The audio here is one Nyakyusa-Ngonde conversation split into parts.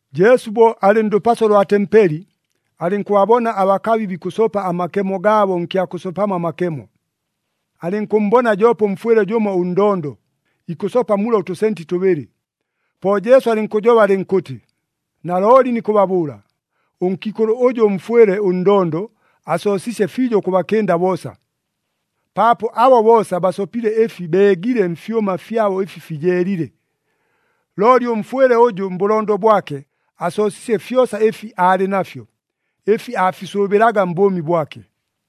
Jesu bo alɨ ndʉpaso lwa tempeli, alɨnkʉbabona abakabi bikʉsopa amakemo gaabo nkya kʉsopamo amakemo. Alɨnkʉmmbona joope ʉmfwɨle jʉmo ʉndondo, ikʉsopa mula ʉtʉsenti tʉbɨlɨ. Po Jesu alɨnkʉjoba alɨnkʉtɨ, “Nalooli nikʉbabʉʉla, ʉnkiikʉlʉ ʉjʉ ʉmfwɨle ʉndondo, asoosiisye fiijo ʉkʉbakɨnda boosa. Paapo abo boosa basopile ɨfi beegile mfyʉma fyabo ɨfi fijeelile, looli ʉmfwɨle ʉjʉ mbʉlondo bwake asoosiisye fyosa ɨfi aalɨ nafyo, ɨfi aafisʉʉbɨlaga mbʉʉmi bwake!”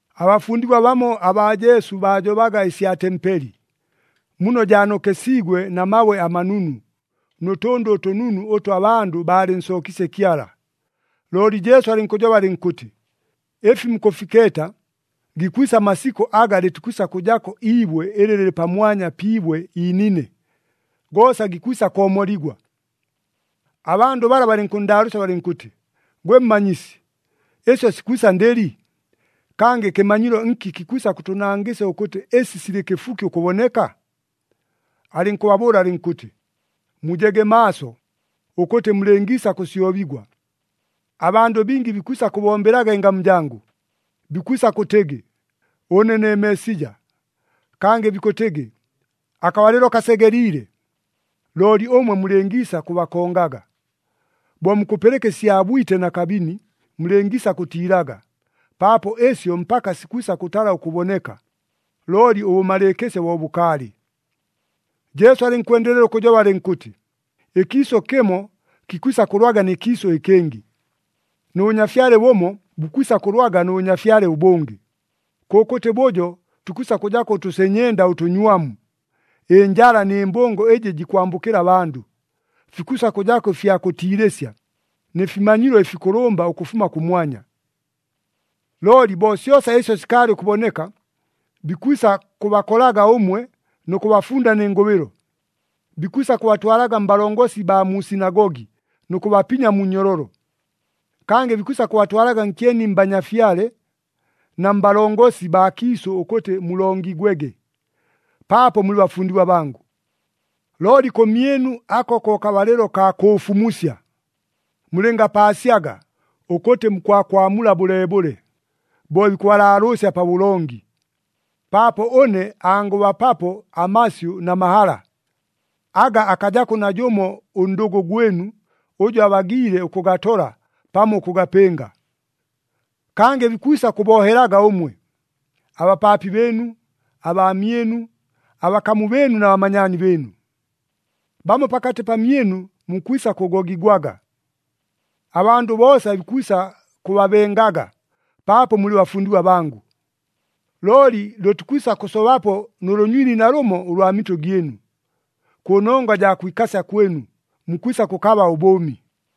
Abafundigwa bamo abaa Jesu baajobaga ɨsya tempeli, muno jaanokesiigwe na mabwe amanunu, nʉ tʉndʉ ʉtʉnunu ʉtʉ abandʉ baalɨnsookiisye Kyala. Looli Jesu alɨnkʉjoba alɨnkʉtɨ, “Ɨfi mukʉfikeeta, gikwisa amasikʉ aga lɨtikwisa kʉjako iibwe ɨlɨ lɨlɨ pamwanya pi ibwe iinine. Goosa gikwisa koomoligwa!” Abandʉ bala balɨnkʉnndaalʉʉsya balɨnkʉtɨ, “Gwe Mmanyisi, ɨsyo sikwisa ndɨli? Kangɨ kɨmanyilo nki kikwisa kʉtʉnangɨsya ʉkʉtɨ ɨsi silɨ kɨfuki ʉkʉboneka?” Alɨnkʉbabʉʉla alɨnkʉtɨ, “Mujege maaso, ʉkʉtɨ mulɨngiisa kʉsyobigwa! Abandʉ bingi bikwisa kʉbombelaga ɨngamu jangʉ, bikwisa kʉtɨgɨ, ‘Ʉne ne Meesija!’ Kangɨ bikʉtɨgɨ, ‘Akabalɨlo kasegeliile!’ Looli ʉmwe mulɨngiisa kʉbakongaga! Bo mukʉpɨlɨka ɨsya bwite na kabini, mulɨngiisa kʉtiilaga. Paapo ɨsyo mpaka sikwisa kʉtala ʉkʉboneka, looli ʉbʉmalɨɨkɨsyo bo bʉkaalɨ.” Jesu alɨnkwendelela ʉkʉjoba alɨnkʉtɨ, “Ɨkiisʉ kɨmo kikwisa kʉlwaga nɨ kiisʉ ɨkɨngɨ, nʉ bʉnyafyale bʉmo bukwisa kʉlwaga nʉ bʉnyafyale ʉbʉngɨ. Kʉkʉtɨ bʉjo tukwisa kʉjako ʉtʉsenyenda ʉtʉnywamu, ɨnjala nɨ mbʉngo ɨjɨ jikwambʉkɨla abandʉ. Fikwisa kʉjako ɨfya kʉtiilɨsya, nɨ fimanyilo ɨfikʉlʉmba ʉkʉfuma kʉmwanya. “Looli bo syosa ɨsyo sikaalɨ ʉkʉboneka, bikwisa kʉbakolaga ʉmwe nʉ kʉbafunda nɨ ngʉbɨlo, bikwisa kʉbatwalaga mbalongosi baa mu sinagogi, nʉ kʉbapinya mu nnyololo. Kangɨ bikwisa kʉbatwalaga nkyeni mbanyafyale na mbalongosi baa kiisʉ ʉkʉtɨ mulongigwege, paapo mulɨ bafundigwa bangʉ. Looli kʉmyɨnu ako ko kabalɨlo kaa kʉʉfumusya. Mulɨngapaasyaga, ʉkʉtɨ mukwakwamula bʉleebʉle, bo bikʉbalaalʉʉsya pabʉlongi. Paapo ʉne angʉbapapo amasyʉ na mahala, aga akajako najʉmo ʉndʉgʉ gwɨnu, ʉjʉ abagiile ʉkʉgatola pamo ʉkʉgapɨnga. “Kangɨ bikwisa kʉboohelaga ʉmwe, abapaapi bɨɨnu, abaamyɨnu, abakamu bɨɨnu na bamanyaani bɨɨnu. Bamo pakatɨ pamyɨnu mukwisa kʉgogigwaga. Abandʉ boosa bikwisa kʉbabengaga, paapo mulɨ bafundigwa bangʉ. Looli lʉtikwisa kʉsobapo nʉ lʉnywili nalʉmo ʉlwa mitʉ gyɨnu! Kʉnongwa jaa kwikasya kwɨnu, mukwisa kʉkaba ʉbʉʉmi.”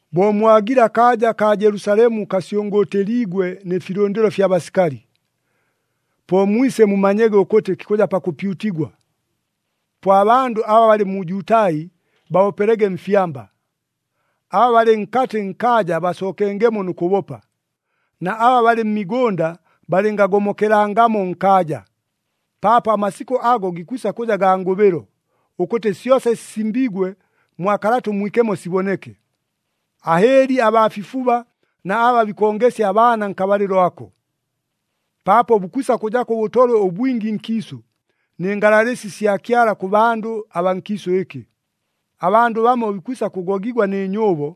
“Bo mwagile akaaja kaa Jelusalemu kasyʉngʉʉtɨliigwe nɨ filʉndɨlo fya basikali, po mwise mumanyege ʉkʉtɨ kikʉja pakʉpyutigwa. Po abandʉ aba balɨ mu Jutai babopelege mfyamba, aba balɨ nkatɨ nkaaja basookengemo nʉ kʉbopa, na aba balɨ mmigʉnda balɨngagomokelangamo nkaaja. Paapo amasikʉ ago gikwisa kʉja gaa ngʉbɨlo, ʉkʉtɨ syosa ɨsi sisimbiigwe mwa Kalata ʉMwikemo siboneke. Ahɨɨli abaa fifuba na aba bikongesya abaana nkabalɨlo ako! Paapo bukwisa kʉjako ʉbʉtolwe ʉbwingi nkiisʉ, nɨ ngalalɨsi sya Kyala kʉ bandʉ abaa nkiisʉ ɨkɨ. Abandʉ bamo bikwisa kʉgogigwa nɨ nyʉʉbo,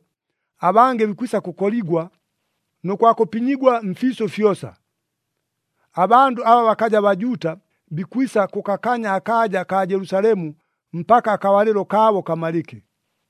abangɨ bikwisa kʉkoligwa, nʉ kwa kʉpinyigwa mfiisʉ fyosa. Abandʉ aba bakaja Bajuuta, bikwisa kʉkakanya akaaja kaa Jelusalemu mpaka akabalɨlo kaabo kamalɨke.”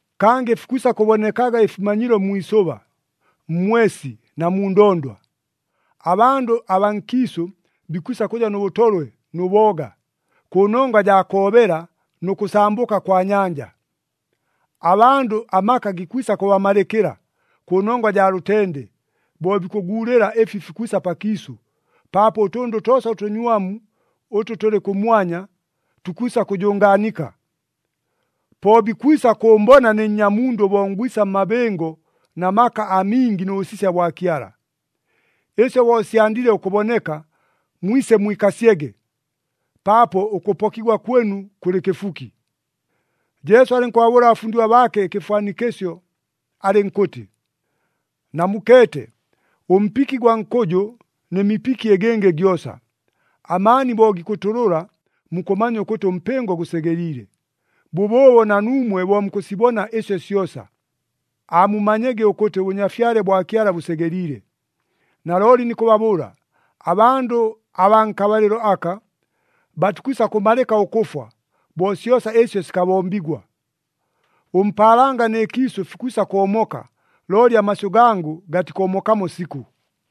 “Kangɨ fikwisa kʉbonekaga ɨfimanyilo mwi isʉba, mmwesi na mu ndondwa. Abandʉ abaa nkiisʉ, bikwisa kʉja nʉ bʉtolwe nʉ booga, kʉnongwa jaa koobela nʉ kʉsambʉka kwa nyanja. Abandʉ amaka gikwisa kʉbamalɨkɨla, kʉnongwa jaa lʉtende, bo bikʉguulɨla ɨfi fikwisa pakiisʉ, paapo ʉtʉndʉ toosa ʉtʉnywamu ʉtʉ tʉlɨ kʉmwanya, tukwisa kʉjʉngaanika. “Po bikwisa kʉʉmbona ne Nnyamundʉ bo ngwisa mmabɨngo na maka amingi nʉ bʉsisya bwa Kyala. Ɨsyo bo syandile ʉkʉboneka, mwise mwikasyege, paapo ʉkʉpokigwa kwɨnu kʉlɨ kɨfuki!” Jesu alɨnkʉbabʉʉla abafundigwa baake ɨkɨfwanikɨsyo, alɨnkʉtɨ, “Namukeete ʉmpiki gwa nkʉjʉ nɨ mipiki ɨgɨngɨ gyosa. Amaani bo gikʉtʉlʉla, mukʉmanya ʉkʉtɨ ʉmpɨngo gʉsegeliile. Bʉbʉʉbo na nuumwe bo mukʉsibona ɨsyo syosa, aamumanyege ʉkʉtɨ ʉBʉnyafyale bwa Kyala bʉsegeliile. Nalooli nikʉbabʉʉla, abandʉ abaa nkabalɨlo aka, batikwisa kʉmalɨka ʉkʉfwa, bo syosa ɨsyo sikabombigwa. Ʉmpaalanga nɨ kiisʉ fikwisa koomoka, looli amasyʉ gangʉ gatikoomokamo sikʉ.”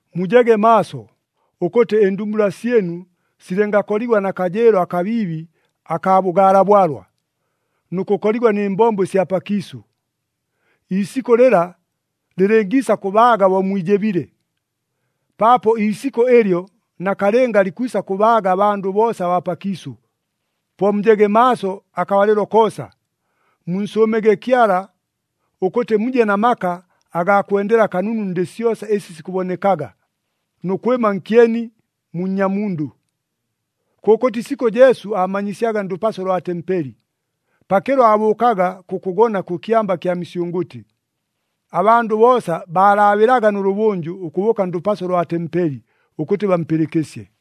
“Mujege maaso, ʉkʉtɨ ɨndumbula syɨnu silɨngakoligwa na kajɨɨlo akabiibi akaa bʉgaala bwalwa, nʉ kʉkoligwa nɨ mbombo ɨsya pakiisʉ. Iisikʉ lɨla lɨlɨngiisa kʉbaaga bo mwijɨbile. Paapo iisikʉ ɨlyo nakalɨnga likwisa kʉbaaga abandʉ boosa abaa pakiisʉ. Po mujege maaso akabalɨlo koosa, munsʉʉmege Kyala, ʉkʉtɨ muje na maka agaa kwendela kanunu ndɨ syosa ɨsi sikʉbonekaga, nʉ kwɨma nkyeni mu Nnyamundʉ.” Kʉkʉtɨ isikʉ Jesu aamanyisyaga ndʉpaso lwa tempeli. Pakɨlo aabʉʉkaga kʉkʉgona kʉ Kyamba kya Misyʉngʉtɨ. Abandʉ boosa baalaabɨlaga nʉlʉbʉnjʉ ʉkʉbʉʉka ndʉpaso lwa tempeli, ʉkʉtɨ bampɨlɨkɨsye.